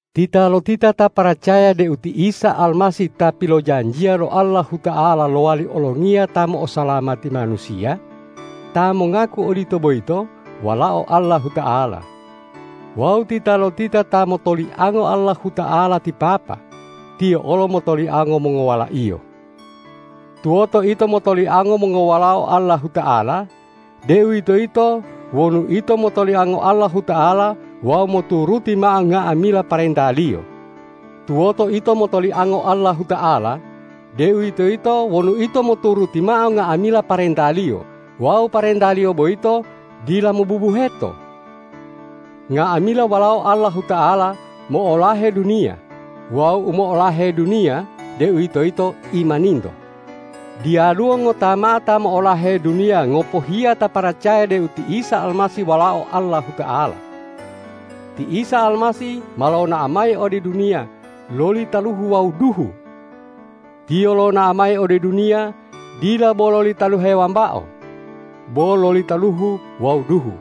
Titalotita ta paracaya deu ti Isa Almasih ta pilojanjiya lo Allahuta'ala lowali olongiya ta mo'osalamati manusiya, ta mongaku odito boyito walao Allahuta'ala. Wawu titalotita ta motoliango Allahuta'ala ti Papa, tiyo olo motoliango mongowala-Iyo. Tuwoto ito motoliango mongowalao Allahuta'ala, deuwitoyito wonu ito motoliango Allahuta'ala wawu moturuti mao nga'amila parenta-Liyo. Tuwoto ito motoliango Allahuta'ala, deuwitoyito wonu ito moturuti mao nga'amila parenta-Liyo wawu parenta-Liyo boyito dila mobubuheto. Nga'amila walao Allahuta'ala mo'olahe duniya wawu u mo'olahe duniya, deuwitoyito imaninto. Diyaluwo ngota mao ta mo'olahe duniya ngopohiya ta paracaya deu ti Isa Almasih Walao Allahuta'ala. Ti Isa Almasih ma lonao mayi ode duniya loli taluhu wawu duhu. Tiyo lonao mayi ode duniya dila bo loli taluhe wambao, bo loli taluhu wawu duhu.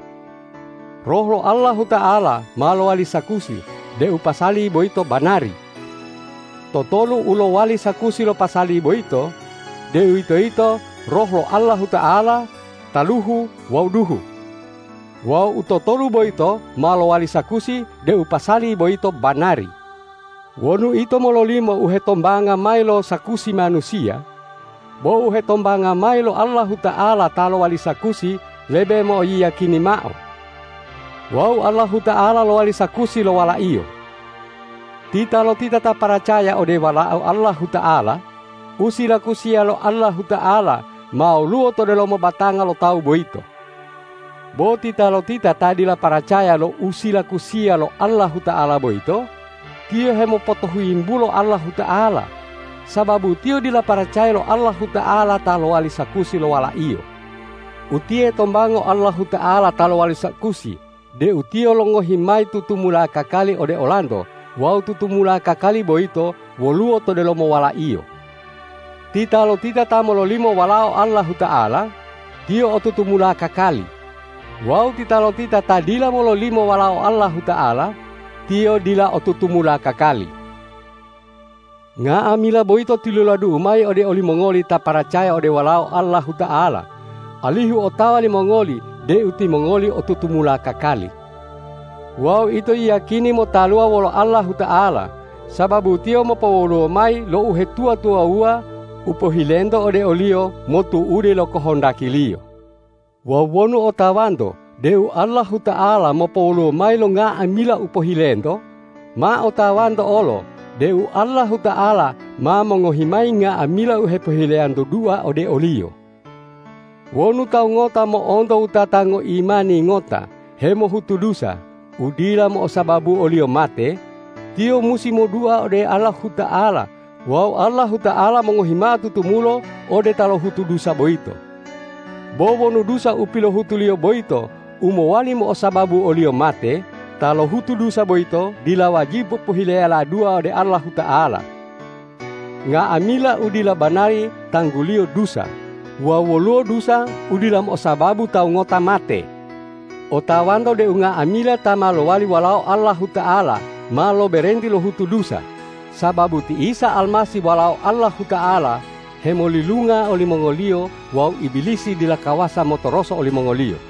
Roh lo Allahuta'ala ma lowali sakusi deu pasali boyito banari. Totolu u lowali sakusi lo pasali boyito, deuwitoyito Roh lo Allahuta'ala, taluhu wawu duhu. Wawu u totolu boyito ma lowali sakusi deu pasali boyito banari. Wonu ito mololimo u hetombanga mayi lo sakusi manusiya, bo u hetombanga mayi lo Allahuta'ala ta lowali sakusi lebe mo'oyiyakini mao. Wawu Allahuta'ala lowali sakusi lo Wala-Iyo. Titalotita ta paracaya ode Walao Allahuta'ala, u silakusiya lo Allahuta'ala ma woluwo to delomo batanga lo tawu boyito. Bo titalotita ta dila paracaya lo u silakusiya lo Allahuta'ala boyito, tiyo hemotohuyimbulo Allahuta'ala, sababu tiyo dila paracaya lo Allahuta'ala ta lowali sakusi lo Wala-Iyo. Utiye tombango Allahuta'ala ta lowali sakusi deu Tiyo longohi mayi tutumula kakali ode olanto wawu tutumula kakali boyito woluwo to delomo Wala-Iyo. Titalotita ta mololimo Walao Allahuta'ala, tiyo o tutumula kakali; wawu titalotita ta dila mololimo Walao Allahuta'ala, tiyo dila o tutumula kakali. Nga'amila boyito tiluladu'u mayi ode olimongoli ta paracaya ode Walao Allahuta'ala, alihu otawa limongoli deu timongoli o tutumula kakali. Wawu ito yiyakini motaluwa wolo Allahuta'ala, sababu Tiyo mopowoluwo mayi lo uhetuwa-tuwawuwa u pohilento ode o-Liyo motu'ude lo kohondaki-Liyo. Wawu wonu otawanto deu Allahuta'ala mopowoluwo mayi lo nga'amila u pohilento, ma otawanto olo deu Allahuta'ala ma mongohi mayi nga'amila u hepohileyanto dua ode o-Liyo. Wonu tawu ngota mo'onto wutata ngoimani ngota hemohutu dusa u dila mo'osababu oliyo mate, tiyo musi modua ode Allahuta'ala wawu Allahuta'ala mongohi mao tutumulo ode ta lohutu dusa boyito. Bo wonu dusa u pilohutuliyo boyito u mowali mo'osababu oliyo mate, ta lohutu dusa boyito dila wajibu pohileyala dua ode Allahuta'ala. Nga'amila u dila banari tangguliyo dusa wawu woluwo dusa u dila mo'osababu tawu ngota mate. Otawanto deu nga'amila ta ma lowali walao Allahuta'ala ma loberenti lohutu dusa, sababu ti Isa Almasih Walao Allahuta'ala hemolilunga olimongoliyo wawu Ibilisi dila kawasa motoroso olimongoliyo.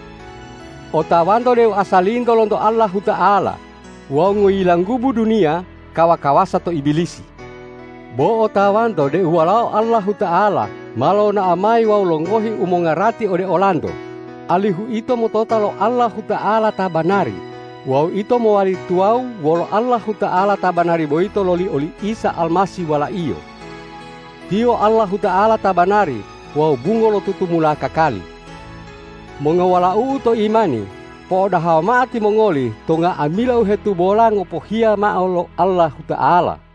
Otawanto deu asalinto lonto Allahuta'ala wawu ngoyilanggubu duniya kawa-kawasa to Ibilisi. Bo otawanto deu Walao Allahuta'ala ma lonao mayi wawu longohi u mongarati ode olanto, alihu ito motota lo Allahuta'ala ta banari wawu ito mowali tuwawu wolo Allahuta'ala ta banari boyito loli oli Isa Almasih Wala-Iyo. Tiyo Allahuta'ala ta banari wawu bungo lo tutumula kakali. Mongowalau'u to imani, po'odaha mao timongoli to nga'amila u hetubola ngopohiya mao lo Allahuta'ala.